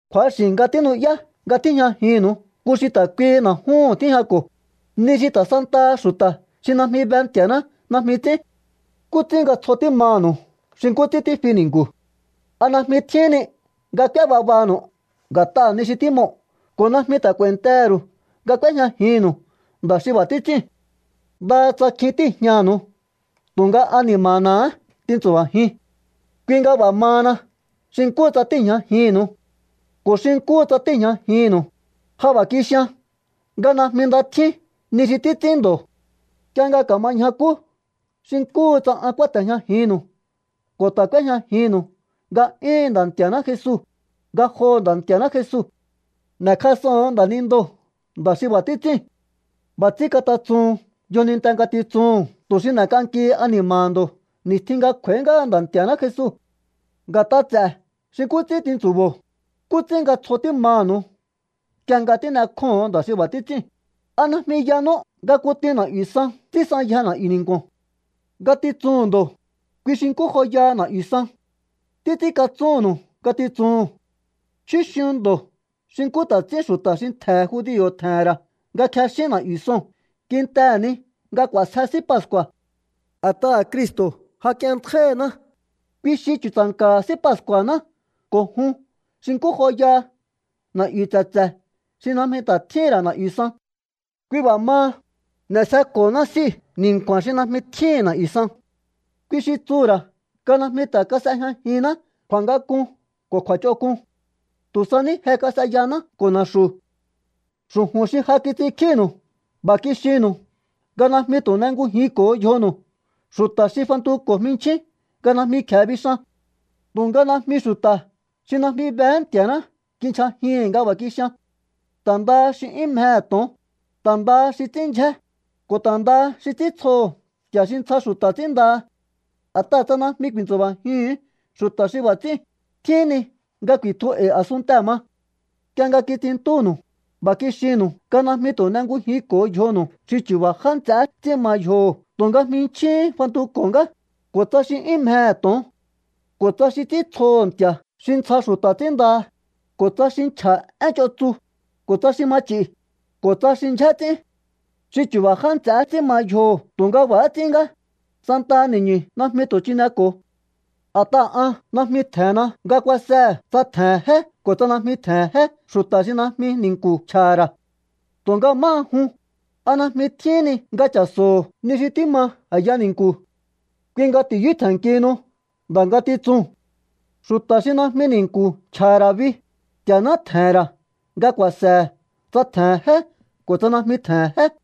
Kju̱axi̱ nga tínu'yá nga tíjñajinnu̱u nku xi ta̱ kuihi na̱júhu̱n tíjñako̱, ni xi ta̱ santaha xu̱ta̱ xi najmi be Nti̱a̱ná najmi ts'ín. ¿Nkú ts'ín nga tsjo tímaha̱nu̱u xi nkú ts'ín tífi ni̱nku̱? ¿A najmi tjíhín ni nga k'úé babanu̱u nga̱t'aha̱ ni xi tímoo̱ ko̱ najmi ta̱ k'u̱a̱i̱ntehe̱ ru̱u nga k'úéjñajinnu̱u nda̱ xi b'a̱ tits'íu̱n? Ndaha tsa kjin tíi̱jñanu̱u tu̱nga ani̱ma̱na̱há tintsu̱ba̱jiun. Kui nga b'a̱ mahana xi nkúhu tsa tíi̱jñajinnu̱u. Ko̱ xi nkúhu tsa tíi̱jñajinnu̱u, ja b'a̱ kixian nga najmi nda tjín ni xi títs'ín ndo̱. Nk'ie nga ka̱ma ñjakú xi nkúhu tsa an kúáte̱jñajinnu̱u ko̱ ta̱ k'úéjñajinnu̱u nga'yúhu̱n Nda̱ Nti̱a̱ná Jesu, ngajoho̱ Nda̱ Nti̱a̱ná Jesu n'e̱kjas'oho̱on nda̱nindoo̱ nda̱ xi b'a̱ títs'íu̱n. B'a̱ ts'ín katatsuhun yjoninte ngatitsuhu̱n tu̱ xi n'e̱k'ankihi ani̱ma̱ha̱ ndo̱ ni̱stjin nga kj'u̱a̱í ngáha Nda̱ Nti̱a̱ná Jesu. Nga̱t'a ts'e̱ xi nkú ts'ín tintsu̱bo̱o, ¿nkú ts'ín nga tsjo tímaha̱nu̱u nk'ie nga tín'ekjóho̱on nda̱ xi b'a̱ títs'íu̱n? ¿A najmi yanú nga kutin na̱'yu̱ san ts'ínsanyje na̱'yu̱ ni̱nku̱o̱n? Ngatitsuhu̱n ndo̱, kui xi nkú joyaha na̱'yu̱ san. Títs'ínkatsúnnu̱u ngatitsuhu̱n. Chjúxiun ndo̱ xi nkú ta̱ ts'ín xu̱ta̱ xi ntje̱he̱ judio̱ tje̱he̱n ra̱ nga kjexín na̱'yu̱ soo̱n kintehe̱ ni nga k'u̱a̱sje S'í Pascu̱a̱. A̱t'aha̱ Cristo̱ ja k'ienntjáí ngandaná, kui xi chu̱tsa̱nka̱ha̱ S'í Pascu̱a̱ná ko̱ jun xi nkú joyaha na̱'yu̱ tse̱tse̱ xi najmi ta̱ tjíhi̱n ra̱ na̱'yu̱ san. Kui b'a̱ maha, n'e̱sjeko̱honá S'íu̱ ni̱nku̱a̱n xi najmi tjíhi̱n na̱'yu̱ san. Kui xi tsuhu̱ ra̱ nga najmi ta̱ kas'ejñajinná kju̱a̱ngak'un ko̱ kju̱a̱ch'onk'un. Tu̱ sa ní je kas'eyaná ko̱ na̱xu̱. Xu̱ju̱n xi ja kits'inkjínu̱u b'a̱ kixinnu̱u nga najmi tu̱ n'engujinko̱o yjonu̱u xu̱ta̱ xi fantuko̱ jminchjín nga najmi kje̱e bixan. Tu̱nga najmi xu̱ta̱ xi najmi behé Nti̱a̱ná kinchjajihi̱n nga b'a̱ kixian. Ta̱ ndaha xi 'yún mjehe̱ to̱on, ta̱ ndaha xi ts'ín ndyjé, ko̱ ta̱ ndaha xi ts'íntsjoho̱ nti̱a̱ xi ntsja xu̱ta̱ ts'ínndaha. A̱t'aha̱ tsa najmi ku̱i̱ntsu̱ba̱jihu̱un xu̱ta̱ xi b'a̱ ts'íu̱n, tjíhín ni nga ku̱i̱tju e̱i̱ a̱sunntee̱ ma. Nk'ie nga kits'inntúnu̱u, b'a̱ kixinnu̱u nga najmi tu̱ n'engujinko̱o yjonu̱u xi chu̱ba̱ já nts'eé ts'ín ma yjoho̱ tu̱nga jminchjíhín fantuko̱ ngá, ko̱ tsa xi 'yún mjehe̱ to̱on, ko̱ tsa xi ts'íntsjoho̱ nti̱a̱ xi ntsja xu̱ta̱ ts'ínndaha, ko̱ tsa xi nchja̱ én ch'on tsu, ko̱ tsa xi ma ch'i̱, ko̱ tsa xi ndyjé ts'ín. Xi chu̱ba̱ já nts'ehé ts'ín ma yjoho̱ tu̱nga b'a̱há ts'ín ngá, santaha ni̱ñu̱ najmi tu̱ chineko̱o. A̱t'aha̱ an najmi tje̱henna nga kuasehe̱ tsa tje̱he̱n jé ko̱ tsa najmi tje̱he̱n jé xu̱ta̱ xi najmi ni̱nku̱ nchja̱ha̱ ra̱. Tu̱nga máha jun, ¿a najmi tjíhín ni nga cha̱so̱ho̱ ni xi tíma a̱ya ni̱nku̱? Kui nga ti̱yú tje̱nnkihinu nda̱ ngatitsuu̱n. Xu̱ta̱ xi najmi ni̱nku̱ nchja̱ha̱ ra̱ bi, Nti̱a̱ná tje̱he̱n ra̱ nga ku̱a̱se̱he̱ tsa tje̱he̱n jé ko̱ tsa najmi tje̱he̱n jé.